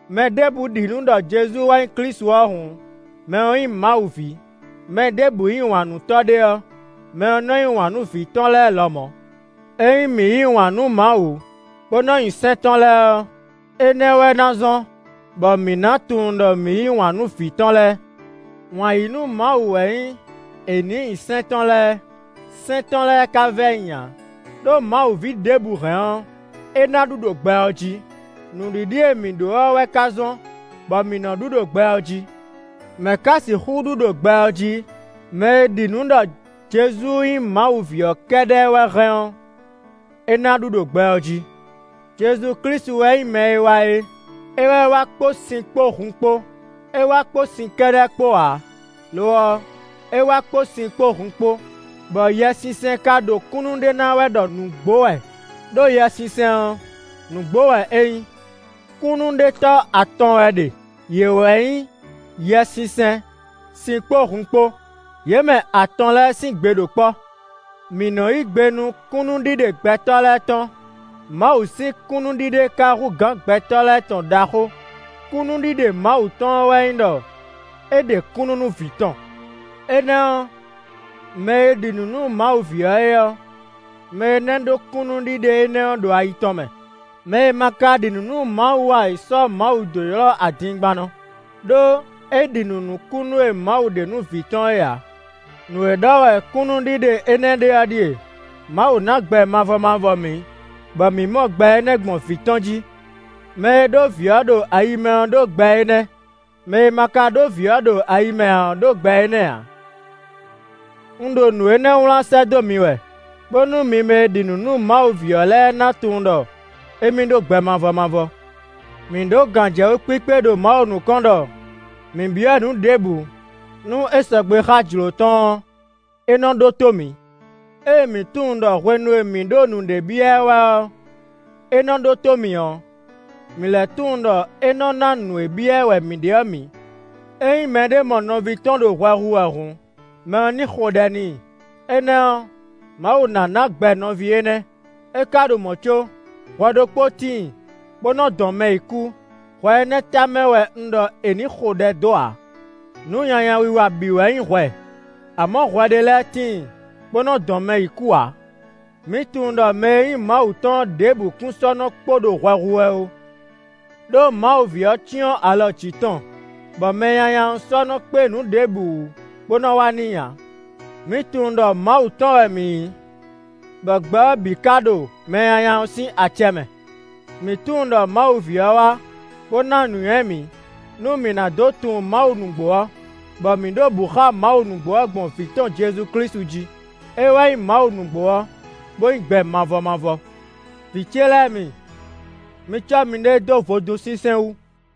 Mɛ ɖěbǔ ɖi nǔ ɖɔ Jezu wɛ nyí Klísu ɔ́ hǔn, mɛ ɔ́ nyí Mawu ví. Mɛ ɖěbǔ yí wǎn nú tɔ́ ɖé ɔ́, mɛ ɔ́ nɔ yí wǎn nú vǐ tɔn lɛ́ɛ lɔmɔ̌. Ényí mǐ yí wǎn nú Mawu, bó nɔ nyi sɛ́n tɔn lɛ́ɛ ɔ́, énɛ́ wɛ ná zɔ́n bɔ mǐ ná tunwun ɖɔ mǐ yí wǎn nú vǐ tɔn lɛ́ɛ. Wǎn yí nú Mawu wɛ nyí è nǐ nyi sɛ́n tɔn lɛ́ɛ; sɛ́n tɔn lɛ́ɛ ka vɛ́ nyi ǎ; ɖó Mawu ví ɖěbǔ hɛn ɔ́, é ná ɖu ɖo gbɛ ɔ́ jí. Nǔɖiɖi e mǐ ɖǒ ɔ́ wɛ ka nɔ zɔ́n bɔ mǐ nɔ ɖu ɖo gbɛ ɔ́ jí. Mɛ̌ ka sixú ɖu ɖo gbɛ ɔ́ jí? Mɛ e ɖi nǔ ɖɔ Jezu nyí Mawu ví ɔ́ kɛ́ɖɛ́ wɛ hɛn ɔ́, é ná ɖu ɖo gbɛ ɔ́ jí. Jezu Klísu wɛ nyí mɛ e wá é; é wɛ wá kpó sin kpó hun kpó; é wá kpó sin kɛ́ɖɛ́ kpó ǎ; lo ɔ́, é wá kpó sin kpó hun kpó, bɔ Yɛsinsɛn ka ɖo kúnnu ɖe ná wɛ ɖɔ nǔgbó wɛ, ɖó Yɛsinsɛn ɔ́, nǔgbó wɛ é nyí. Kúnnuɖetɔ́ atɔn wɛ ɖe; Yě wɛ nyí: Yɛsinsɛn, sin kpó hun kpó. Yě mɛ atɔn lɛ́ɛ sín gbe ɖo kpɔ́. Mǐ nɔ yí gbe nú kúnnuɖiɖe gbɛtɔ́ lɛ́ɛ tɔn; Mawu sín kúnnuɖiɖe ka hú gǎn gbɛtɔ́ lɛ́ɛ tɔn ɖaxó. Kúnnuɖiɖe Mawu tɔn ɔ́ wɛ nyí ɖɔ é ɖe kúnnu nú vǐ tɔn. Énɛ́ ɔ́, mɛ e ɖi nǔ nú Mawu ví ɔ́ é ɔ́, mɛ énɛ́ ɖó kúnnuɖiɖe énɛ́ ɔ́ ɖo ayi tɔn mɛ; mɛ e ma ka ɖi nǔ nú Mawu ǎ é sɔ́ Mawu dó ylɔ́ adingbannɔ; ɖó é ɖi nǔ nú kúnnu e Mawu ɖe nú vǐ tɔn é ǎ. Nǔ e ɖɔ wɛ kúnnuɖiɖe énɛ́ ɖe ɔ́ ɖíe: Mawu ná gbɛ mavɔ mavɔ mǐ, bɔ mǐ mɔ gbɛ énɛ́ gbɔn vǐ tɔn jí. Mɛ e ɖó vǐ ɔ́ ɖo ayi mɛ ɔ́ ɖó gbɛ énɛ́; mɛ e ma ka ɖó vǐ ɔ́ ɖo ayi mɛ ǎ ɔ́ ɖó gbɛ énɛ́ ǎ. Un ɖo nǔ énɛ́ wlán sɛ́ dó mi wɛ bónú mi mɛ e ɖi nǔ nú Mawu ví ɔ́ lɛ́ɛ ná tunwun ɖɔ émí ɖó gbɛ mavɔ mavɔ. Mǐ ɖǒ gǎnjɛwú kpíkpé ɖo Mawu nukɔn ɖɔ mǐ byɔ́ nǔ ɖěbǔ nú é sɔgbe xá jlǒ tɔn ɔ́, é nɔ ɖótó mǐ. Ée mǐ tunwun ɖɔ hwenu e mǐ ɖo nǔɖé byɔ́ ɛ wɛ ɔ́, é nɔ ɖótó mǐ ɔ́, mǐ lɛ́ tunwun ɖɔ é nɔ ná nǔ e byɔ́ ɛ wɛ mǐ ɖe ɔ́ mǐ. Ényí mɛɖé mɔ nɔví tɔn ɖo hwɛ hu wɛ hǔn, mɛ ɔ́ ní xo ɖɛ n'i; énɛ́ ɔ́, Mawu ná ná gbɛ nɔví énɛ́. É ka ɖo mɔ̌ có, hwɛ ɖokpó tíin bó nɔ dɔn mɛ yi kú; hwɛ énɛ́ tamɛ wɛ un ɖɔ è nǐ xo ɖɛ dó ǎ. Nǔ nyanya wiwa bǐ wɛ nyí hwɛ; amɔ̌ hwɛ ɖé lɛ́ɛ tíin bó nɔ dɔn mɛ yi kú ǎ. Mǐ tunwun ɖɔ mɛ e nyí Mawu tɔn ɔ́ ɖěbǔ kún sɔ́ nɔ kpo ɖo hwɛ hu wɛ ó, ɖó Mawu ví ɔ́ cyɔ́n alɔ jǐ tɔn, bɔ Mɛnyanya ɔ́ sɔ́ nɔ kpé nǔ ɖěbǔ wú bó nɔ wa n'i ǎ. Mǐ tunwun ɖɔ Mawu tɔn wɛ mǐ nyí, bɔ gbɛ ɔ́ bǐ ka ɖo Mɛnyanya ɔ́ sín acɛ mɛ. Mǐ tunwun ɖɔ Mawu ví ɔ́ wá, bó ná nǔnywɛ́ mǐ, nú mǐ ná dó tunwun Mawu nǔgbó ɔ́, bɔ mǐ ɖo bǔ xá Mawu nǔgbó ɔ́ gbɔn vǐ tɔn Jezu Klísu jí; é wɛ nyí Mawu nǔgbó ɔ́, bó nyí gbɛ mavɔ mavɔ. Vǐ ce lɛ́ɛ mi, mi cɔ́ miɖée dó vodún sinsɛn wú.